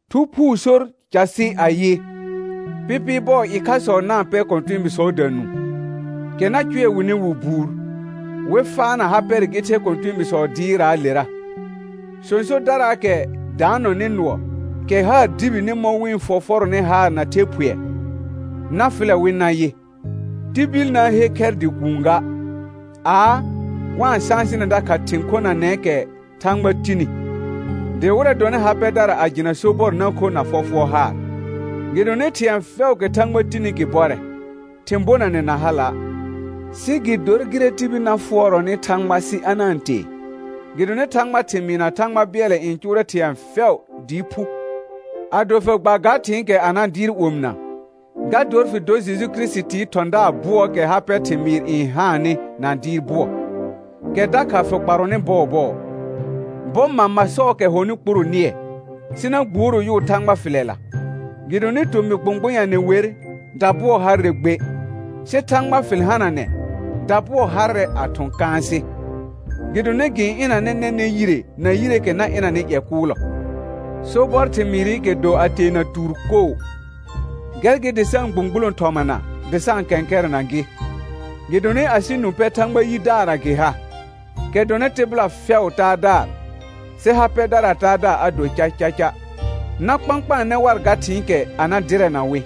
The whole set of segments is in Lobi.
Thu Phuu sor casɩ ayɩ: Pɩpɩɩ bɔɔ ɩkhasɔ na-n pɛr kɔ̃tɛɛbiisɔɔda nũu, kɛ na cʋɛ wɩnɩ wɩ buur, wɩ faana ha pɛrɛ gɩ the kɔ̃tɛɛbiisɔɔ dɩɩrraalera. Sõsodaraakɛ daanɔnɩ nʋɔ, kɛ haar dibini mɔ̃ wɩ-n fɔfɔrɔnɩ haar na the phʋɛ, na fɩlɛ wɩ nayɩ, tibil na-n he khɛr dɩ kuun ga; aa, wa-n sãsɩnɛ dakha thɩ̃ khonanɛɛkɛ Thãgba tini, dɩ wɩrɛ dɔnɩ ha pɛdara a jɩna sobɔr na kho na fɔfʋɔr haar. Gɩdonɩ thɩ̃ɛ fɛʋʋkɛ Thãgba tini gɩ bɔrɛ, thɩ̃ bonanɛ na hala', sɩ gɩ dor gɩrɛ tibil na fʋɔrɔnɩ Thãgba sɩ a na-n tee; gɩdonɩ Thãgbaa thɩmɩɩ na Thãgba bɩɛlɛ n cʋʋrɛ thɩ̃ɛ fɛʋ dɩɩ phu. Ado fɩ gba ga thɩ̃ɩkɛ a na dɩɩr omɩna, ga dor fɩ dor Jeju Kirisitii thɔ̃daar bʋɔɔkɛ ha pɛ thɩmɩɩr n haannɩ na dɩɩr bʋɔ, kɛ dakha fɩ kparɔnɩ bɔɔbɔɔ. Bɔ mama sɔɔkɛ hɔnɩ kpuro nɩɛ, sɩ na gbuoro yʋʋ Thãgba fɩlɛla. Gɩdonɩ tomɩ gbʋ̃gbʋnyanɛ wer, dabʋɔ harrɛ gbe, sɩ Thãgba fɩl hananɛ, dabʋɔ harrɛ a thʋ̃ kãasɩ, gɩdonɩ gɩ-n ɩnanɛ nɛnɛ̃ yire na yireekɛ na ɩnanɩ ƴɛ kʋʋlɔ. Sobɔr thɩmɩɩrɩkɛ do a teena tuur koo. Gɛr gɩ dɩ sa-n gbũgbulõ thɔmana dɩ sa-n kɛ̃kɛrɛna gɩ, gɩdonɩ asɩ nũ pɛ Thãgba yidaarra gɩ ha, kɛ dɔnɩ tɩbɩla fɛʋʋ Taadaar, sɩ ha pɛdaraa Taadaar a do cacaca. Na kpãkpaanɛ war ga thɩ̃ɩkɛ a na dɩrɛna wɩ.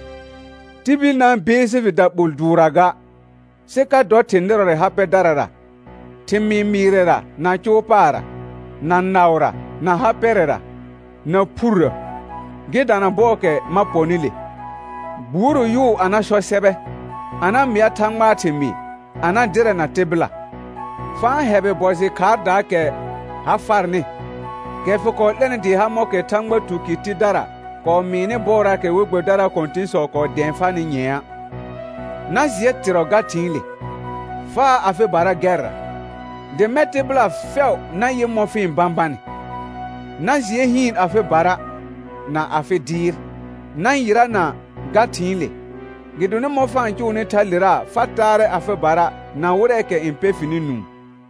Tibil na-n beesi lɩ daɓol dʋʋrra ga, sɩ ka dɔ thɩ̃ nɩrɔrɛ ha pɛdarara, thɩmɩɩ mɩɩrɛra na cʋʋ paarra, na naʋra, na ha pɛrɛra, na phurrə. Gɩ dana bɔɔkɛ ma pɔnɩ le, gbuoro yʋʋ a na sɔ sɛbɛ, a na mɩa Thãgbaa thɩmɩɩ, a na dɩrɛna tɩbɩla. Fa-n hɛbɩ bɔ jɩ khaardaakɛ ha farnɩ, kɛ fɩ kɔɔ 'lɛnɩ dɩɩ ha mɔ̃kɛ Thãgba tukɩr tidara kɔɔ mɩɩnɩ bɔɔraakɛ we gbɛbɩdaraa kɔ̃tɩ̃sɔ kɔɔ dɛ̃ɛ farnɩ nyɛ̃a'. Na jɩɛ tɩrɔ ga thɩ̃ɩle; faa afɩbara gɛrra, dɩ mɛ̃ tɩbɩla fɛʋ na yɩ mɔ̃ fɩ-n bãbanɩ. Na jɩɛ hɩɩn afɩbara, na afɩ dɩɩr, na yɩrana ga thɩ̃ɩle; gɩdonɩ mɔ̃ fa-n cʋʋnɩ thalera fa taarɛ afɩbara na wɩrɛɛkɛ n pɛ fɩnɩ nũu.